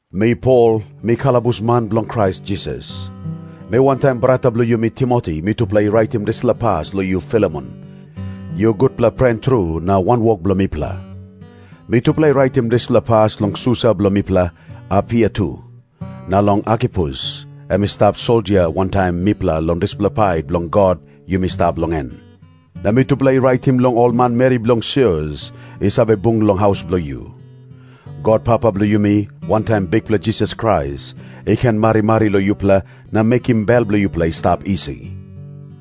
Mi Pol, mi kalabusman bilong Krais Jisas. Mi wantaim brata bilong yumi Timoti, mitupela i raitim dispela pas long yu Filemon, yu gutpela pren tru na wanwok bilong mipela. Mitupela i raitim dispela pas long susa bilong mipela Apia tu, na long Arkipus, em i stap soldia wantaim mipela long dispela pait bilong God yumi stap long en. Na mitupela i raitim long ol manmeri bilong sios i save bung long haus bilong yu. God Papa bilong yumi, wantaim Bikpela Jisas Krais, i ken marimari long yupela na mekim bel bilong yupela i stap isi.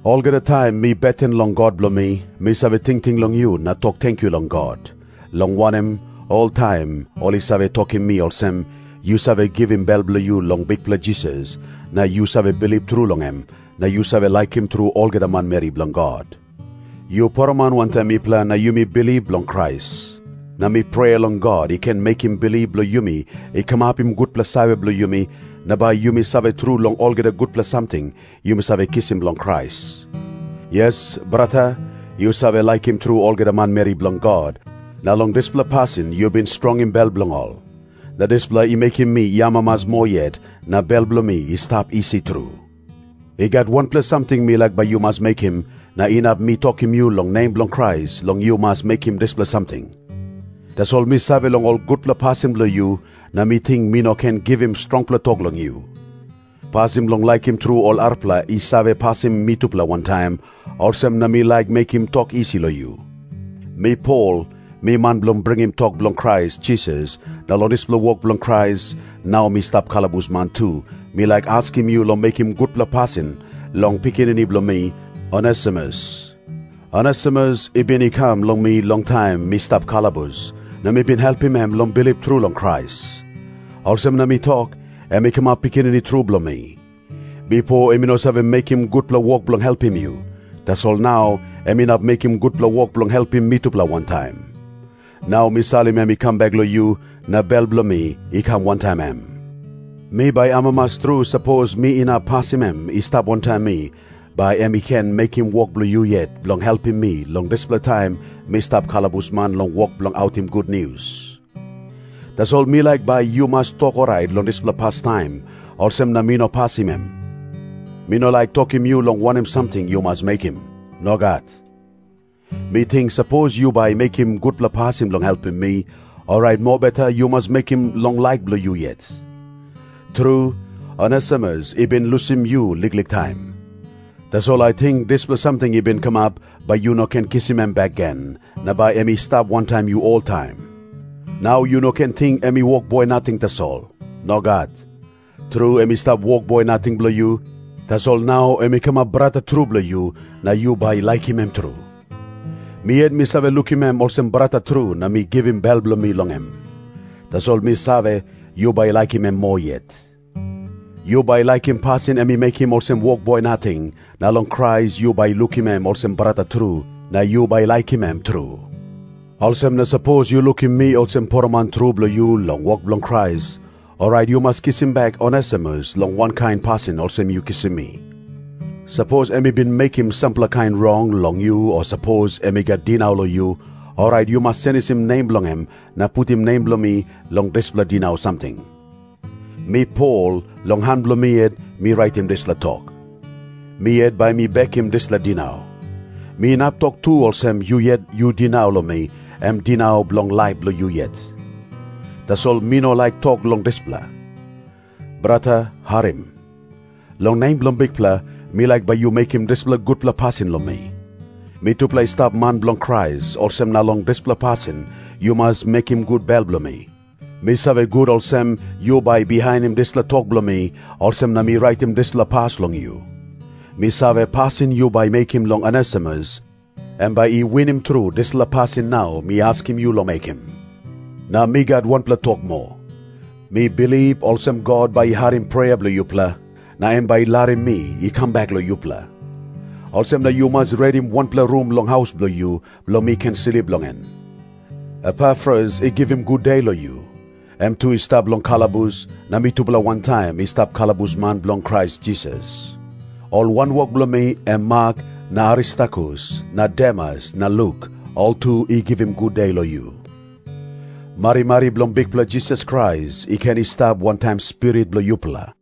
Olgeta taim mi beten long God bilong mi, mi save tingting long yu na tok tenkyu long God, long wanem, oltaim ol i save tokim mi olsem, yu save givim bel bilong yu long Bikpela Jisas na yu save bilip tru long em, na yu save laikim tru olgeta manmeri bilong God. Yu poroman wantaim mipela na yumi bilip long Krais, na mi prea long God i ken mekim bilip bilong yumi i kamapim gutpela save bilong yumi, na bai yumi save tru long olgeta gutpela samting yumi save kisim long Krais. Yes, brata, yu save laikim tru olgeta manmeri bilong God, na long dispela pasin yu bin strongim bel bilong ol. Na dispela i mekim mi i amamas moa yet na bel bilong mi i stap isi tru. I gat wanpela samting mi laik bai yu mas mekim, na inap mi tokim yu long nem bilong Krais long yu mas mekim dispela samting. Tasol mi save long ol gutpela pasin bilong yu, na mi ting mi no ken givim strongpela tok long yu. Pasin bilong laikim tru ol arapela i save pasim mitupela wantaim, olsem na mi laik mekim tok isi long yu. Mi Pol, mi man bilong bringim tok bilong Krais Jisas na long dispela wok bilong Krais nau mi stap kalabusman tu, mi laik askim yu long mekim gutpela pasin long pikinini bilong mi, Onesimus. Onesimus i bin i kam long mi long taim mi stap long kalabus, na mi bin helpim em long bilip tru long Krais. Olsem na mi tok, em i kamap pikinini tru bilong mi. Bipo em i no save mekim gutpela wok bilong helpim yu. Tasol nau em inap mekim gutpela wok bilong helpim mitupela wantaim. Nau mi salim em i kam bek long yu, na bel bilong mi i kam wantaim em. Mi bai amamas tru sapos mi inap pasim em i stap wantaim mi, bai em i ken mekim wok bilong yu yet bilong helpim mi long dispela taim mi stap kalabusman long wok bilong autim gutnius. Tasol mi laik bai yu mas tok orait long dispela pastaim, olsem na mi no pasim em. Mi no laik tokim yu long wanem samting yu mas mekim. Nogat. Mi ting, sapos yu bai mekim gutpela pasin bilong helpim mi, orait mobeta yu mas mekim long laik bilong yu yet. Tru, Onesimus i bin lusim yu liklik taim. Tasol ating dispela samting i bin kamap, bai yu ken kisim em bek gen, na bai em i stap wantaim yu oltaim. Nau yu no ken ting em i wokboi nating tasol. Nogat. Tru, em i stap wokboi nating bilong yu, tasol nau em i kamap brata tru bilong yu na yu bai laikim em tru. Mi yet mi save lukim em olsem brata tru na mi givim bel bilong mi long em. Tasol mi save, yu bai laikim em moa yet. Yu bai laikim pasin em i mekim olsem wokboi nating, na long Krais yu bai lukim em olsem brata tru, na yu bai laikim em tru. Olsem na sapos yu lukim mi olsem poroman tru bilong yu long wok bilong Krais, orait yu mas kisim bek Onesimus long wankain pasin olsem yu kisim mi. Sapos em i bin mekim sampela kain rong long yu o sapos em i gat dinau long yu, orait yu mas senisim nem bilong em na putim nem bilong mi long dispela dinau samting. Mi Pol, long han bilong mi yet mi raitim dispela tok. Mi yet bai mi bekim dispela dinau. Mi inap tok tu olsem yu yet yu dinau long mi, em dinau bilong laip bilong yu yet. Tasol mi no laik tok long dispela. Brata, harim. Long nem bilong Bikpela, mi laik bai yu mekim dispela gutpela pasin long mi. Mitupela i stap man bilong Krais, olsem na long dispela pasin yu mas mekim gut bel bilong mi. Mi save gut olsem, yu bai bihainim dispela tok bilong mi, olsem na mi raitim dispela pas long yu. Mi save, pasin yu bai mekim long Onesimus, em bai i winim tru dispela pasin nau mi askim yu long mekim. Na mi gat wanpela tok moa. Mi bilip olsem God bai i harim prea bilong yupela, na em bai i larim mi i kam bek long yupela. Olsem na yu mas redim wanpela rum long haus bilong yu, bilong mi ken slip long en. Epafras i givim gude long yu. Em tu i stap long kalabus, na mitupela wantaim i stap kalabusman bilong Krais Jisas. Ol wanwok bilong mi, em Mak na Aristarkus na Demas na Luk, ol tu i givim gude long yu. Marimari bilong Bikpela Jisas Krais i ken i stap wantaim spirit bilong yupela.